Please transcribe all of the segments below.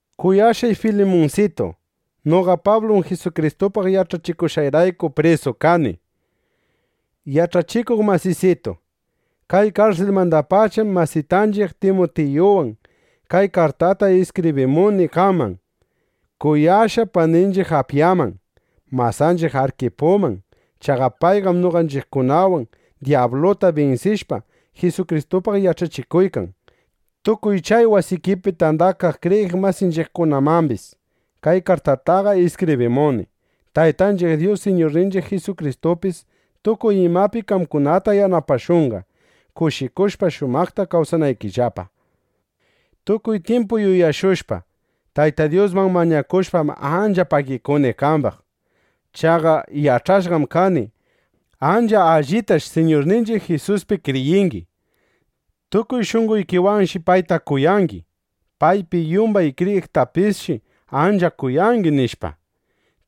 Kuyashqay Filimunsitu, noqa Pablum Jisukristupaq yach'achikushqayrayku prisu kani. Yach'achikuq masisitu, kay karsilmandapacham masitanchiq Timutiyuwan kay kartata iskibrimuni qaman, kuyashqa paninchiq Apyaman, masanchiq Arkipuman. Chaqa payqam noqanchiqwan dyabluta binsishpa, Jisukristupaq yach'achikuykan. Tukuy chay wasikipi tandakaq kriyiq masinchiqkunamambis kay kartataqa iskibrimuni. Taytanchiq Dyus, Siñurninchiq Jisukristupis tukuy imapi qamkunata yanapashunqa, kushikushpa shumaqta kawsanaykillapa. Tukuy tyimpu yuyashushpa, Tayta Dyusman mañakushpam, ancha pagikuni qambaq. Chaqa yach'ashqam kani: Ancha allitash Siñurninchiq Jisuspi kriyingi. Tukuy shunqoykiwanshi payta kuyangi. Paypi yumbay kriyiqtapisshi ancha kuyangi, nishpa.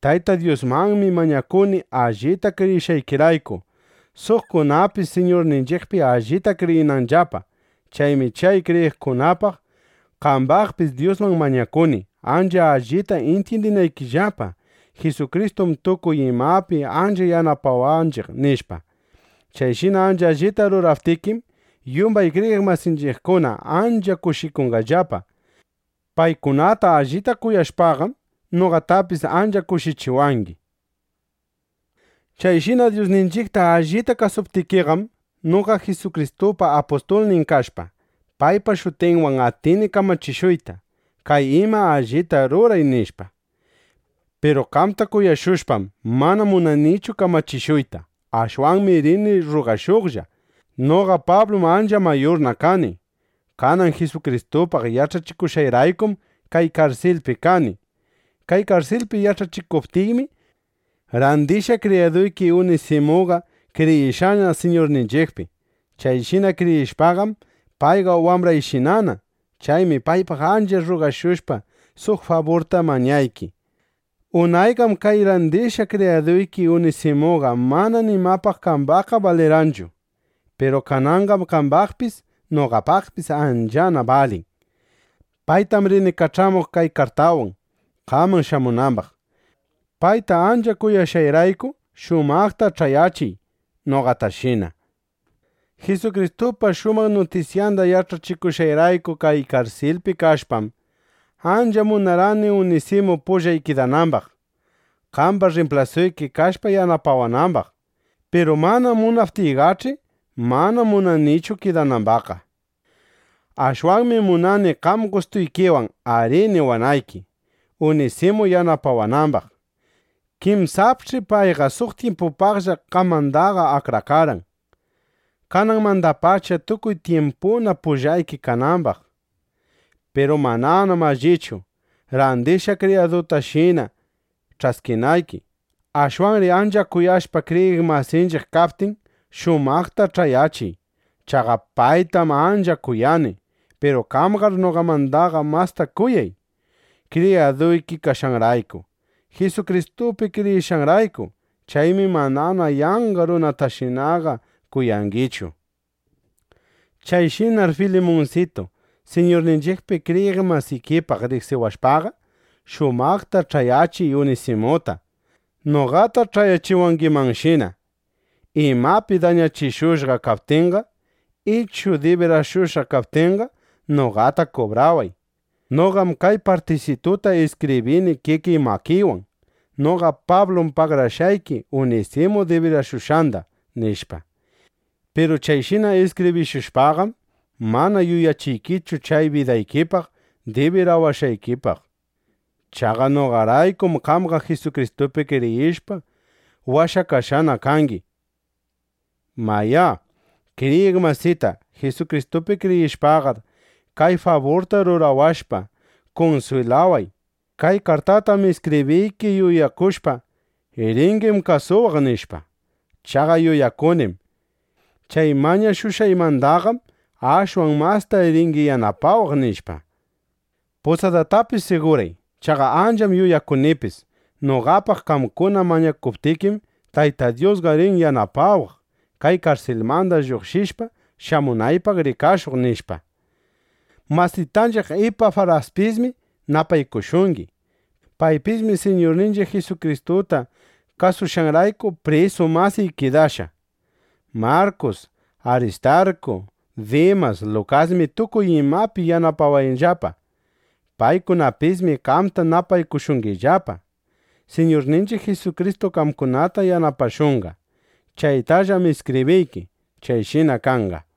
Tayta Dyusmanmi mañakuni, allita kriyishqaykirayku, suqkunapis Siñurninchiqpi allita kriyinanllapa. Chaymi chay kriyiqkunapaq, qambaqpis Dyusman mañakuni, ancha allita intyindinaykillapa: Jisukristum tukuy imapi ancha yanapawanchiq, nishpa. Chayshina ancha allita ruraptikim, yumbay kriyiq masinchiqkuna ancha kushikunllapa. Paykunata allita kuyashpaqam, noqatapis ancha kushichiwangi. Chayshina Dyusninchiqta allita kasuptikiqam, noqa Jisukristupa apustulnin kashpa, paypa shutinwan atini kamachishuyta: “Kay ima allita ruray”, nishpa. Piru qamta kuyashushpam, mana munanichu kamachishuyta. Ashwanmi rini rrugashuqlla. Noqa Pablum ancha mayurna kani. Kanan Jisukristupaq yach'achikushqayraykum kay karsilpi kani. Kay karsilpi yach'achikuptiymi, randishqa kriyaduyki Unisimuqa kriyishqana Siñurninchiqpi. Chayshina kriyishpaqam, payqa wambrayshinana. Chaymi paypaq ancha rrugashushpa, suq faburta mañayki. Unayqam kay randishqa kriyaduyki Unisimuqa mana nimapaq qambaqqa balirqanchu. Piru kananqam qambaqpis, noqapaqpis anchana balin. Paytam rini kach'amuq kay kartawan, qaman shamunambaq. Payta ancha kuyashqayrayku, shumaqta ch'ayachiy noqatashina. Jisukristupa shumaq nutisyanda yach'achikushqayrayku kay karsilpi kashpam, ancha munarqani Unisimu pullay kidanambaq, qamba rrimplasuyki kashpa yanapawanambaq. Piru mana munaptikiqach'i, mana munanichu kidanambaqqa. Ashwanmi munani qam gustuykiwan “arí” niwanayki, Unisimu yanapawanambaq. Kinsapch'i payqa suq tyimpupaqlla qamandaqa akrakarqan, kananmandapacha tukuy tyimpuna pullayki kanambaq. Piru mananam allichu, randishqa kriyadutashina ch'askinayki. Ashwanri ancha kuyashqa kriyiq masinchiq kaptin, shumaqta ch'ayachiy. Chaqa paytam ancha kuyani. Piru qamqar noqamandaqa masta kuyay, kriyaduyki kashqanrayku, Jisukristupi kriyishqanrayku. Chaymi manana yanqa runatashinaqa kuyangichu. Chayshinaqar, Filimunsitu, Siñurninchiqpi kriyiq masikipaq riqsiwashpaqa, shumaqta ch'ayachiy Unisimuta, noqata ch'ayachiwangimanshina. Imapi dañachishushqa kaptinqa, ichu dibirashushqa kaptinqa, noqata kubraway. Noqam kay partisituta iskibrini kikiy makiywan: “Noqa Pablum pagarashqayki Unisimu dibirashushqanda”, nishpa. Piru chayshina iskibrishushpaqam, mana yuyachiykichu chay bidaykipaq dibirawashqaykipaq. (Chaqa noqaraykum qamqa Jisukristupi kriyishpa, washakashqa kangi.) Mayá, kriyiq masita, Jisukristupi kriyishpaqar, kay faburta rurawashpa, kunswilaway. Kay kartatam iskibriyki yuyakushpa: Ringim kasuwaq, nishpa. Chaqa yuyakunim: Chay mañashushqaymandaqam ashwan masta ringi yanapawaq, nishpa. Pusadaytapis siguray. Chaqa ancham yuyakunipis: Noqapaq qamkuna mañakuptikim, Tayta Dyusqa rin yanapawaq, kay karsilmanda lluqshishpa, shamunaypaq rikashuq, nishpa. Masitanchiq Ipafraspismi napaykushungi. Paypismi Siñurninchiq Jisukristuta kasushqanrayku prisu masiy kidashqa. Markus, Aristarku, Dimas, Lukasmi tukuy imapi yanapawanllapa. Paykunapismi qamta napaykushungillapa. Siñurninchiq Jisukristu qamkunata yanapashunqa. (Chaytallam iskibriyki.) Chayshina kanqa.